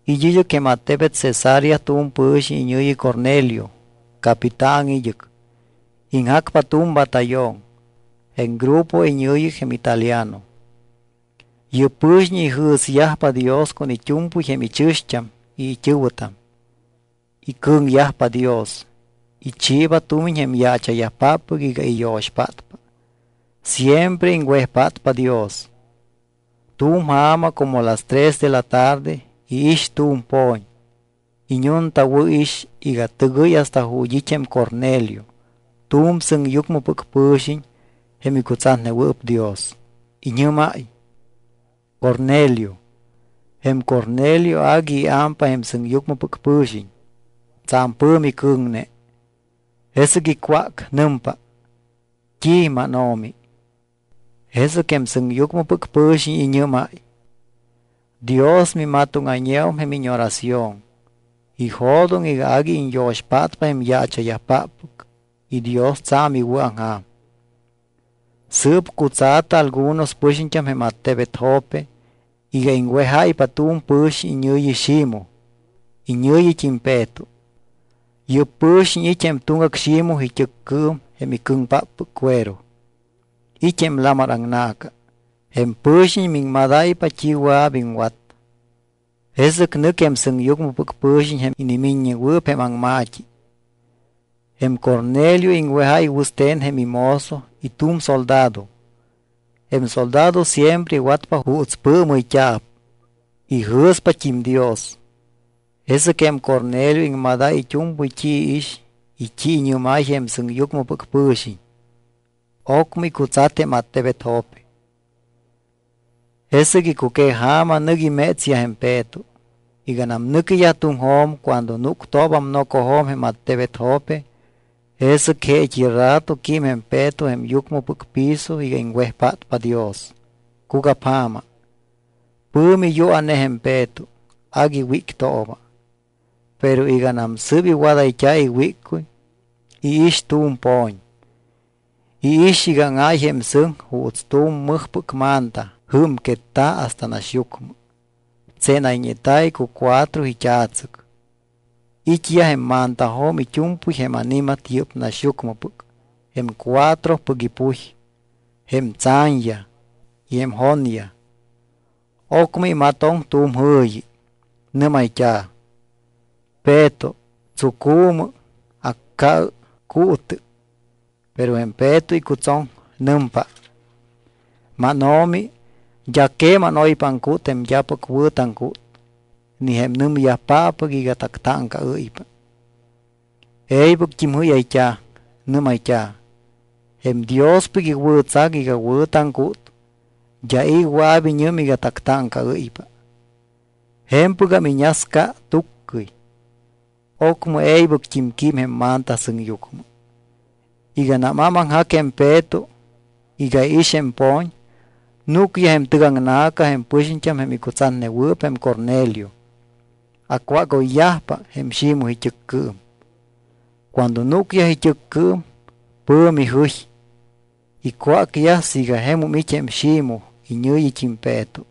It́ id́ɨc jém attebet Cesarea tu̱m pɨ̱xiñ iñɨ̱yi Cornelio. Capitán id́ɨc, iŋjacpa tu̱m batallón, jém grupo iñɨ̱yi jém Italiano. Yɨ́p pɨ̱xiñ ijɨ̱syajpa Dios con it́u̱mpɨy jém ichɨ̱xt́am y it́ɨ̱wɨtam. Icɨ̱ŋyajpa Dios. Ichiiba tumiñ jém yaacha̱yajpáppɨc iga iyo̱xpátpa. Siempre iŋwejpátpa Dios. Tu̱m ja̱ma como las tres de la tarde iix tu̱m po̱ñ. Iñuntawɨ̱ix iga tɨgɨy hasta ju̱t́ it́ jém Cornelio tu̱m sɨŋyucmɨpɨc pɨ̱xiñ jém icutsatnewɨɨp Dios. Iñɨ́máy: —¡Cornelio! Jém Cornelio agui iámpa jém sɨŋyucmɨpɨc pɨ̱xiñ, tsa̱m pɨ̱mi cɨ̱ŋne. Jesɨc icwác. Nɨmpa: —¿T́i, mánO̱mi? Jesɨc jém sɨŋyucmɨpɨc pɨ̱xiñ iñɨ́máy: —Dios mimatóŋayñeum jém íñoración. Ijo̱doŋ iga agui iñyo̱xpátpa jém yaacha̱yajpáppɨc y Dios tsa̱m iwɨ̱aŋja̱m. Sɨɨp cutsa̱tɨ algunos pɨxiñt́am jém attebet Jope iga iŋwejáypa tu̱m pɨxiñ iñɨ̱yi Ximoj, iñɨ̱yit́im Peto. Yɨ́p pɨ̱xiñ it́ jém tuŋgac Ximoj it́ɨccɨɨm jém icɨŋpáppɨc cuero. It́ jém lamar aŋna̱ca. Jém pɨ̱xiñ miŋmadáypa t́i wɨa̱p iŋwat. Jesɨc nɨc jém sɨŋyucmɨpɨc pɨ̱xiñ jém inimiññewɨɨp jém aŋma̱t́i. Jém Cornelio iŋwejáy wɨste̱n jém imozo y tu̱m soldado. Jém soldado siempre iwatpa juuts pɨɨmɨyt́a̱p. Ijɨ̱spat́im Dios. Jesɨc jém Cornelio iŋmadáy it́u̱mpɨy t́i iix y t́i iñɨ́máy jém sɨŋyucmɨpɨc pɨ̱xiñ. Ocmɨ icutsat jém attebet Jope. Jesɨc icuqueja̱ma nɨc imétsyaj jém Peto. Iganam nɨquiyaj tuŋjo̱m cuando núctoobam nocojo̱m jém attebet Jope, jesɨc jeet́i rato quím jém Peto jém yucmɨpɨc piso iga iŋwejpátpa Dios. Cugapja̱ma. Pɨ̱mi yua̱ne jém Peto, agui wíctooba, pero iganam sɨ́p iwadayt́a̱ iwíccuy, iix tu̱m po̱ñ. Iix iga áŋáy jém sɨŋ. Juuts tu̱m mɨjpɨc manta jɨ́mquetta̱ hasta naxyucmɨ, tsénayñeta̱ icucuatro it́a̱tsɨc. It́yaj jém mantajo̱m it́u̱mpɨy jém ani̱mat yɨ́p naxyucmɨpɨc, jém cuatropɨc ipuy, jém tsa̱ñyaj y jém jonyaj. Ocmɨ imatoŋ tu̱m jɨ̱yi. Nɨ́mayt́a̱: —Peto, tsucu̱mɨ, acca̱ɨ, cuutɨ. Pero jém Peto icutsoŋ. Nɨmpa: —MánO̱mi, d́a queman oypa aŋcút jém d́apɨc wɨ̱ taŋcút, ni jém nɨmyajpáppɨc iga tactáŋcaɨ́ypa. E̱ybɨct́im jɨ́yayt́a̱. Nɨ́mayt́a̱: —Jém Diospɨc iwɨ̱tsac iga wɨ̱ taŋcút, d́a i̱ wɨa̱p iñɨm iga tactáŋcaɨ́ypa. Je̱mpɨgam iñasca tuccɨy. Ocmɨ e̱ybɨct́im quím jém manta sɨŋyucmɨ. Iganam ámaŋjac jém Peto iga iix jém po̱ñ, núcyaj jém tɨgaŋna̱ca jém pɨxiñt́am jém icutsatnewɨɨp jém Cornelio. Acwágoyyajpa jém Ximoj it́ɨccɨɨm. Cuando núcyaj it́ɨccɨɨm, pɨ̱mi jɨy. Icwácyaj siiga jemum it́ jém Ximoj iñɨ̱yit́im Peto.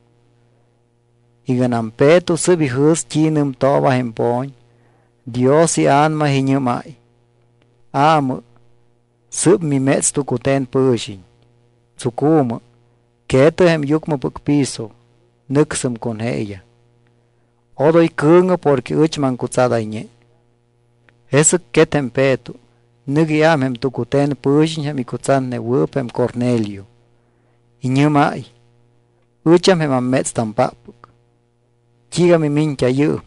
Iganam Peto sɨ́p ijɨ̱s t́i nɨmtooba jém po̱ñ, Dios iA̱nama iñɨ́máy: —Aamɨ, sɨ́p miméts tucute̱n pɨ̱xiñ. Tsucu̱mɨ, que̱tɨ jém yucmɨpɨc piso, nɨcsɨm con jeeyaj. Odoy cɨ̱ŋɨ porque ɨch maŋcutsadayñe. Jesɨc quet jém Peto, nɨc iám jém tucute̱n pɨ̱xiñ jém icutsatnewɨɨp jém Cornelio. Iñɨ́máy: —Ɨcham jém ammétstampáppɨc. ¿T́iiga mimiñt́a yɨɨm?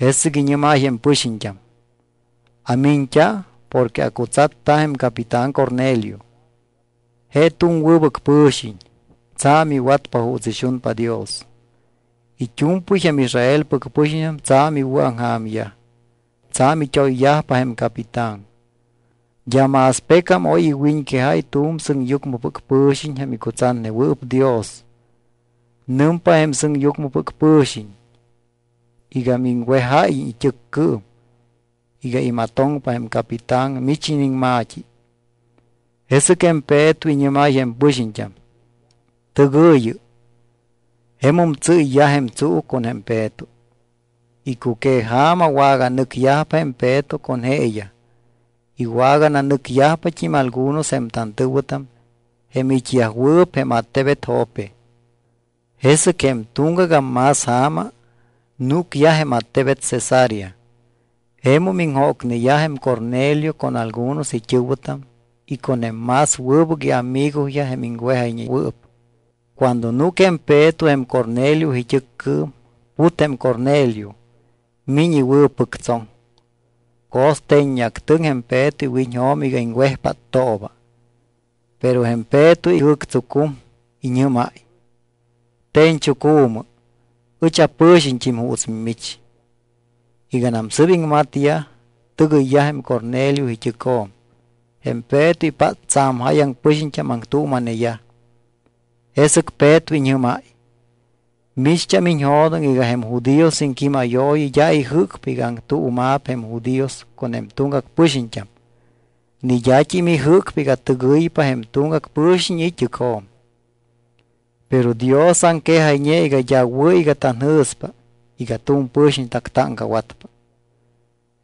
Jesɨc iñɨ́máy jém pɨxiñt́am: —Amiñt́a porque acutsatta jém capitán Cornelio. Je tu̱m wɨbɨc pɨ̱xiñ, tsa̱m iwatpa juuts ixunpa Dios. It́u̱mpɨy jém Israelpɨc pɨxiñt́am tsa̱m iwɨ̱aŋja̱myaj, tsa̱m it́oyyajpa jém capitán. D́a más pecam oy iwiñquejáy tu̱m sɨŋyucmɨpɨc pɨ̱xiñ jém icutsatnewɨɨp Dios. Nɨmpa jém sɨŋyucmɨpɨc pɨ̱xiñ iga miŋwejáyiñ it́ɨccɨɨm iga imatoŋpa jém capitán mich iniŋma̱t́i. Jesɨc jém Peto iñɨ́máy jém pɨxiñt́am: —Tɨgɨ̱yɨ. Jemum tsɨ́yyaj jém tsuu con jém Peto. Icuqueja̱ma waganɨcyajpa jém Peto con jeeyaj. Iwagananɨcyajpat́im algunos jém tantɨ̱wɨtam jém it́yajwɨɨp jém attebet Jope. Jesɨc jém tuŋgagam más ja̱ma, núcyaj jém attebet Cesarea. Jemum iŋjócneyaj jém Cornelio con algunos it́ɨ̱wɨtam y con jém más wɨbɨc iamigoyaj jém iŋwejayñewɨɨp. Cuando núc jém Peto jém Cornelio it́ɨccɨɨm, put jém Cornelio, miñ iwɨ̱pɨctsoŋ. Co̱ste̱ñactɨŋ jém Peto iwiñjo̱m iga iŋwejpáttooba. Pero jém Peto ijɨ̱ctsucum. Iñɨ́máy: —Te̱ñchucu̱mɨ. Ɨch apɨ̱xiñt́im juuts mimich. Iganam sɨɨp iŋmatyaj, tɨgɨyyaj jém Cornelio it́ɨcjo̱m. Jém Peto ipát tsa̱m jáyaŋ pɨxiñt́am aŋtuuma̱neyaj. Jesɨc Peto iñɨ́máy: —Micht́am iñjo̱doŋ iga jém judíos iŋquímayooyi d́a ijɨ́cpa iga aŋtuuma̱p jém judíos con jém tuŋgac pɨxiñt́am ni d́at́im ijɨ́cpa iga tɨgɨypa jém tuŋgac pɨ̱xiñ it́ɨcjo̱m. Pero Dios aŋquejayñe iga d́a wɨ̱ iga tanjɨ̱spa iga tu̱m pɨ̱xiñ tactáŋcawatpa,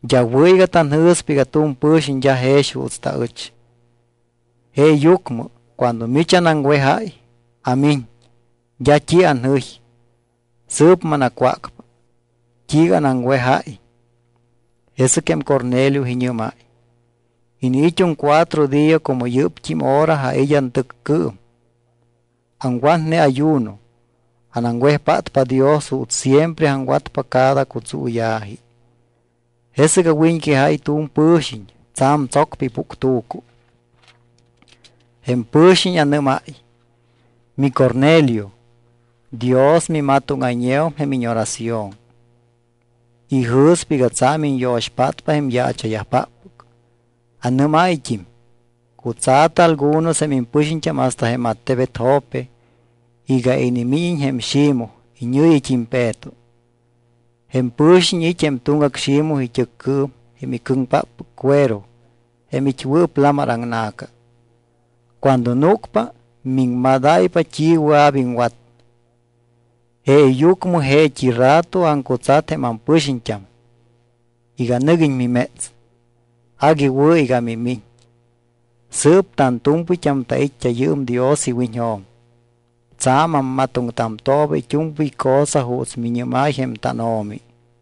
d́a wɨ̱ iga tanjɨ̱spa iga tu̱m pɨ̱xiñ d́a jex juuts taɨch. Jeeyucmɨ cuando mich anaŋwejáy, amiñ. D́a t́i anjɨy. Sɨɨp manacwácpa, ¿t́iiga anaŋwejáy? Jesɨc jém Cornelio iñɨ́máy: —Iniit́um cuatro día como yɨ́pt́im hora ait́ antɨccɨɨm. Aŋwatne ayuno. Anaŋwejpátpa Dios juuts siempre aŋwatpa cada cutsuuya̱ji. Jesɨc awiñquejáy tu̱m pɨ̱xiñ tsa̱m tsocpa ipuctu̱cu. Jém pɨ̱xiñ anɨ́máy: “MiCornelio, Dios mimatóŋayñeum jém íñoración. Ijɨ̱spa iga tsa̱m iñyo̱xpátpa jém yaacha̱yajpáppɨc.” Anɨ́máyt́im: “Cutsa̱tɨ algunos jém impɨxiñt́am hasta jém attebet Jope iga inimíñiñ jém Ximoj iñɨ̱yit́im Peto. Jém pɨ̱xiñ it́ jém tuŋgac Ximoj it́ɨccɨɨm jém icɨŋpáppɨc cuero jém it́wɨɨp lamar aŋna̱ca. Cuando núcpa, miŋmadáypa t́i wɨa̱p iŋwat.” Jeeyucmɨ jeet́i rato aŋcutsat jém ampɨxiñt́am iga nɨguiñ miméts. Agui wɨ̱ iga mimiñ. Sɨɨp tantu̱mpɨyt́am tait́t́a yɨɨm Dios iwiñjo̱m. Tsa̱m ammatoŋtamtooba it́u̱mpɨy cosa juuts miñɨ́máy jém tánO̱mi.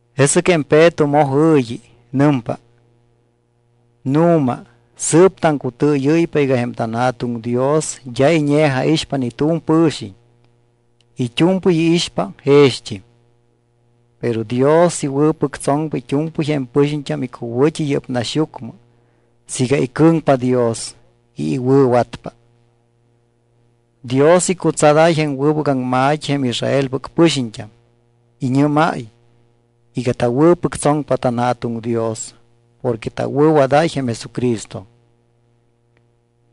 Jesɨc jém Peto moj jɨ̱yi. Nɨmpa: —Nu̱ma sɨɨp taŋcutɨɨyɨ́ypa iga jém tanJa̱tuŋ Dios d́a iñe̱jaixpa ni tu̱m pɨ̱xiñ. It́u̱mpɨy iixpa jext́im. Pero Dios iwɨ̱pɨctsoŋpa it́u̱mpɨy jém pɨxiñt́am icuwɨ̱t́i yɨ́p naxyucmɨ siiga icɨ̱ŋpa Dios y iwɨ̱watpa. Dios icutsadáy jém wɨbɨc aŋma̱t́i jém Israelpɨc pɨxiñt́am. Iñɨ́máy iga tawɨ̱pɨctsoŋpa tanJa̱tuŋ Dios porque tawɨ̱wadáy jém Jesucristo.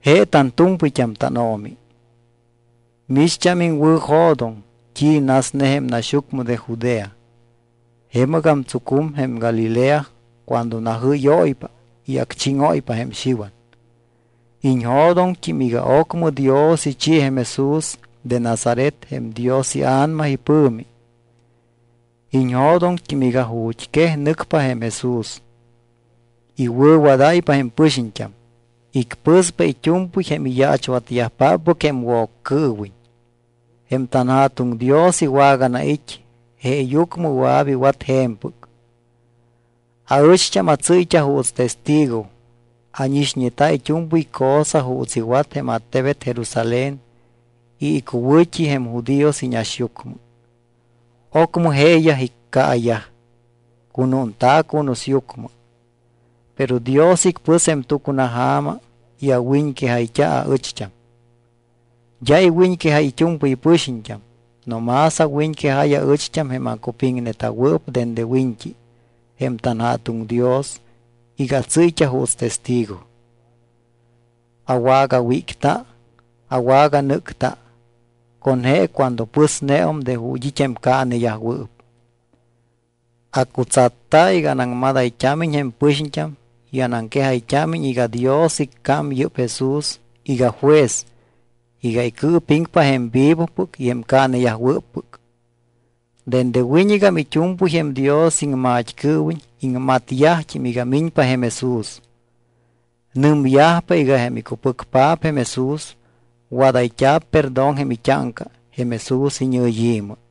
Je tantu̱mpɨyt́am tánO̱mi. Micht́am iŋwɨ̱jo̱doŋ t́i nasne jém naxyucmɨ de Judea. Jemɨgam tsucum jém Galilea cuando najɨ́yóypa y acchíŋóypa jém Xiwan. Iñjo̱doŋt́im iga ocmɨ Dios ichi jém Jesús de Nazaret jém Dios iA̱nama ipɨ̱mi. Iñjo̱doŋt́im iga ju̱t́ quej nɨcpa jém Jesús, iwɨ̱wadáypa jém pɨxiñt́am, icpɨspa it́u̱mpɨy jém iyaachwatyajpáppɨc jém Woccɨɨwiñ. Jém tanJa̱tuŋ Dios iwaganait́, jeeyucmɨ wɨa̱p iwat je̱mpɨc. Aɨcht́am atsɨ́yt́a juuts testigo. Ánixñeta it́u̱mpɨy cosa juuts iwat jém attebet Jerusalén y icuwɨ̱t́i jém judíos iñaxyucmɨ. Ocmɨ jeeyaj iccaayaj, cunúnta̱ cunusyucmɨ. Pero Dios icpɨs jém tucunaja̱ma y awiñquejayt́a aɨcht́am. D́a iwiñquejáy it́u̱mpɨy pɨxiñt́am. No más awiñquejáy aɨcht́am jém acupiŋneta̱wɨɨp dende wiñt́i jém tanJa̱tuŋ Dios iga atsɨ́yt́a juuts testigo. Awagawícta, awaganɨ́cta con je cuando pɨsneum de ju̱t́ it́ jém caaneyajwɨɨp. Acutsatta iga anaŋmadayt́ámiñ jém pɨxiñt́am y anaŋquejayt́ámiñ iga Dios iccám yɨ́pt́im Jesús iga juez iga icɨɨpiŋpa jém vivopɨc y jém caaneyajwɨ́ppɨc. Dende wiñɨgam it́u̱mpɨy jém Dios iŋmat́cɨɨwiñ iŋmatyajt́im iga miñpa jém Jesús. Nɨmyajpa iga jém icupɨcpaap jém Jesús, wadayt́a̱p perdón jém it́áŋca jém Jesús iñɨyi̱mɨ.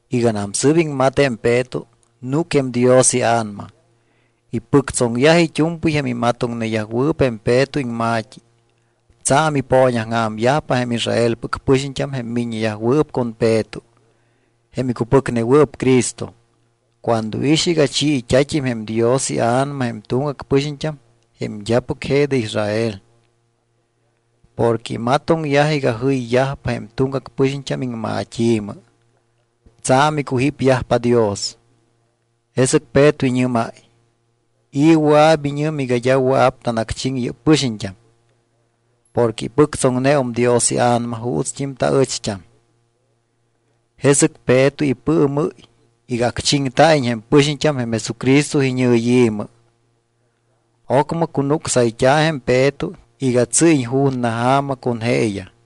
Iganam sɨ́p iŋmat jém Peto, núc jém Dios iA̱nama. Ipɨctsoŋyaj it́u̱mpɨy jém imatoŋneyajwɨɨp jém Peto iŋma̱t́i. Tsa̱m ipooñaŋja̱myajpa jém Israelpɨc pɨxiñt́am jém miññeyajwɨɨp con Peto, jém icupɨcnewɨɨp Cristo, cuando iix iga chiit́a̱t́im jém Dios iA̱nama jém tuŋgac pɨxiñt́am jém d́apɨc je de Israel. Porque imatoŋyaj iga jɨyyajpa jém tuŋgac pɨxiñt́am iŋmat́i̱mɨ. Tsa̱m icujípyajpa Dios. Jesɨc Peto iñɨ́máy: —¿I̱ wɨa̱p iñɨm iga d́a wɨa̱p tanacchiŋ yɨ́p pɨxiñt́am? Porque ipɨctsoŋneum Dios iA̱nama juutst́im taɨcht́am. Jesɨc Peto ipɨɨmɨ́y iga acchiŋyajta̱iñ jém pɨxiñt́am jém Jesucristo iñɨyi̱mɨ. Ocmɨ cunucsayt́a̱ jém Peto iga tsɨ́yiñ ju̱na ja̱ma con jeeyaj.